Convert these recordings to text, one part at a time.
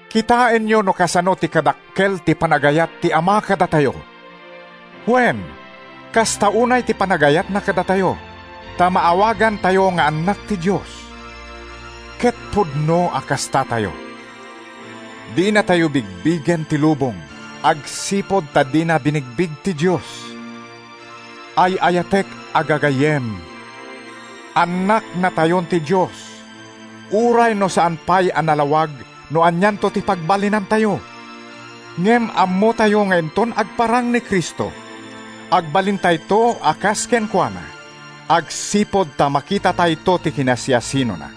Kitaenyo no kasano ti kadakkel ti panagayat ti Ama kadatayo! Wen, kasta unay ti panagayatna kadatayo ta maawagantayo nga annak ti Dios, ket pudno a kastatayo. Dinatayo bigbigen ti lubong agsipud ta dina binigbig ti Dios. Ay-ayatek a gagayyem, annaknatayon ti Dios, uray no saan pay a nalawag no anianto ti pagbalinantayo. Ngem ammotayo nga inton agparang ni Cristo, agbalintayto a kas kenkuana, agsipud ta makitatayto ti kinasiasinona.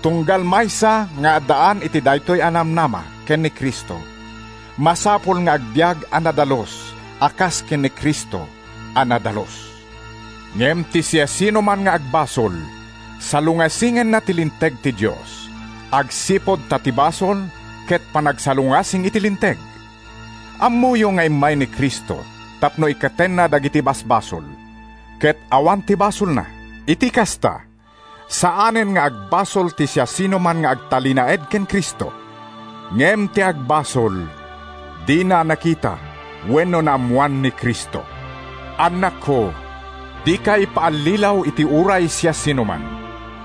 Tunggal maysa nga addaan iti daytoy a namnama ken ni Cristo, masapul nga agbiag a nadalus a kas ken ni Cristo a nadalus. Ngem ti siasinoman nga agbasol, salungasingenna ti linteg ti Dios, agsipud ta ti basol ket panagsalungasing iti linteg. Ammoyo nga immay ni Cristo tapno ikkatenna dagiti basbasol; ket awan ti basolna. Iti kasta, saanen nga agbasol ti siasinoman nga agtalinaed ken Cristo. Ngem ti agbasol, dina nakita wenno naammoan ni Cristo. Annakko, dikay paallilaw iti uray siasinoman.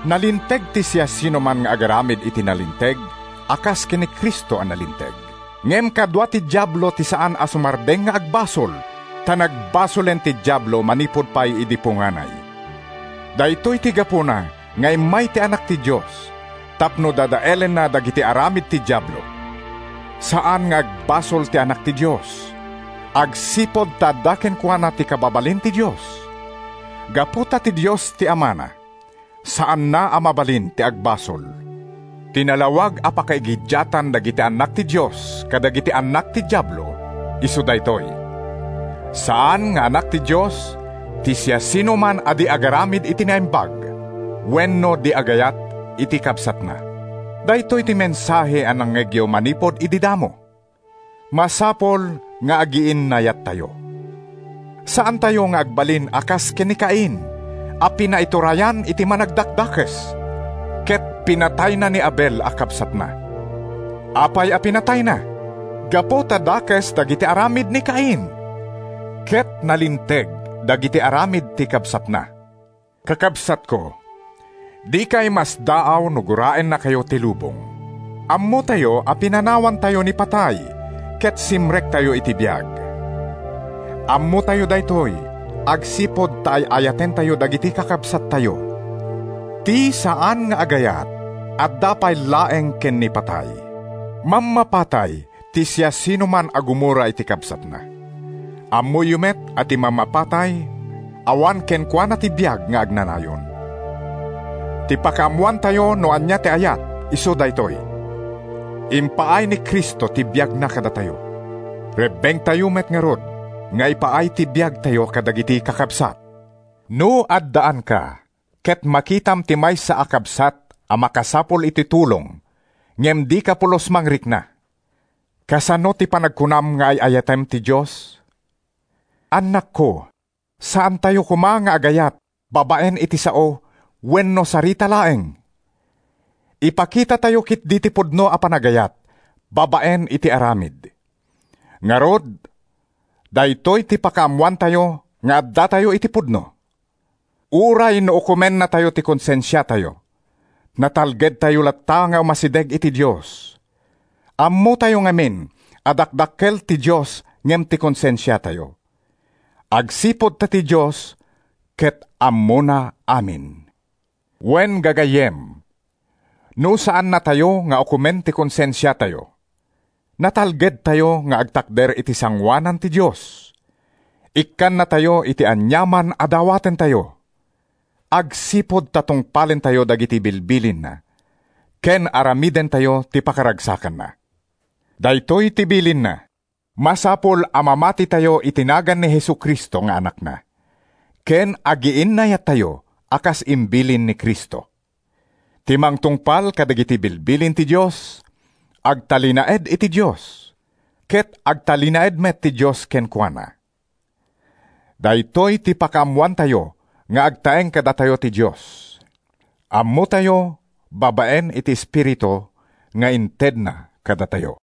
Nalinteg ti siasinoman nga agaramid iti nalinteg a kas ken ni Cristo a nalinteg. Ngem kadua ti Diablo ti saan a sumardeng nga agbasol, ta nagbasolen ti Diablo manipud pay idi punganay. Daytoy ti gapuna nga immay ti Anak ti Dios tapno dadaelenna dagiti aramid ti Diablo. Saan nga agbasol ti anak ti Dios, agsipud ta adda kenkuana ti kababalin ti Dios. Gapu ta ti Dios ti Amana, saanna a mabalin ti agbasol. Ti nalawag a pakaigiddiatan dagiti annak ti Dios kadagiti annak ti Diablo isu daytoy: Saan nga anak ti Dios ti siasinoman a di agaramid iti naimbag wenno di agayat iti kabsatna. Daytoy ti mensahe a nangngegyo manipud idi damo: masapul nga agiinnayattayo. Saantayo nga agbalin a kas ken ni Cain a pinaiturayan iti Managdakdakes ket pinatayna ni Abel a kabsatna. Apay a pinatayna? Gapu ta dakes dagiti aramid ni Cain, ket nalinteg dagiti aramid ti kabsatna. Kakabsatko, dikay masdaaw no guraennakayo ti lubong. Ammotayo a pinanawantayo ni patay ket simrektayo iti biag. Ammotayo daytoy agsipud ta ay-ayatentayo dagiti kakabsattayo. Ti saan nga agayat, adda pay laeng ken ni patay. Mammapatay ti siasinoman a gumura iti kabsatna. Ammoyo met a ti mammapatay awan kenkuana ti biag nga agnanayon. Ti pakaammoantayo no ania ti ayat isu daytoy: Impaay ni Cristo ti biagna kadatayo. Rebbengtayo met ngarud nga ipaay ti biagtayo kadagiti kakabsat! No addaanka ket makitam ti maysa a kabsat a makasapul iti tulong ngem dika pulos mangrikna, kasano ti panagkunam nga ay-ayatem ti Dios? Annakko, saantayo koma nga agayat babaen iti sao wenno sarita laeng. Ipakitatayo ketdi ti pudno a panagayat babaen iti aramid. Ngarud, daytoy ti pakaammoantayo nga addatayo iti pudno. Uray no ukomennatayo ti konsensiatayo, natalgedtayo latta nga umasideg iti Dios. Ammotayo ngamin a dakdakkel ti Dios ngem ti konsensiatayo, agsipud ta ti Dios ket ammona amin. Wen, gagayyem, no saannatayo nga ukomen ti konsensiatayo, natalgedtayo nga agtakder iti sangoanan ti Dios. Ikkannatayo iti aniaman a dawatentayo, agsipud ta tungpalentayo dagiti bilbilinna ken aramidentayo ti pakaragsakanna. Daytoy ti bilinna: Masapul a mamatitayo iti nagan ni Jesu-Cristo nga Anakna ken agiinnayattayo a kas imbilin ni Cristo. Ti mangtungpal kadagiti bilbilin ti Dios, agtalinaed iti Dios, ket agtalinaed met ti Dios kenkuana. Daytoy ti pakaammoantayo nga agtaeng kadatayo ti Dios: Ammotayo babaen iti Espiritu nga intedna kadatayo.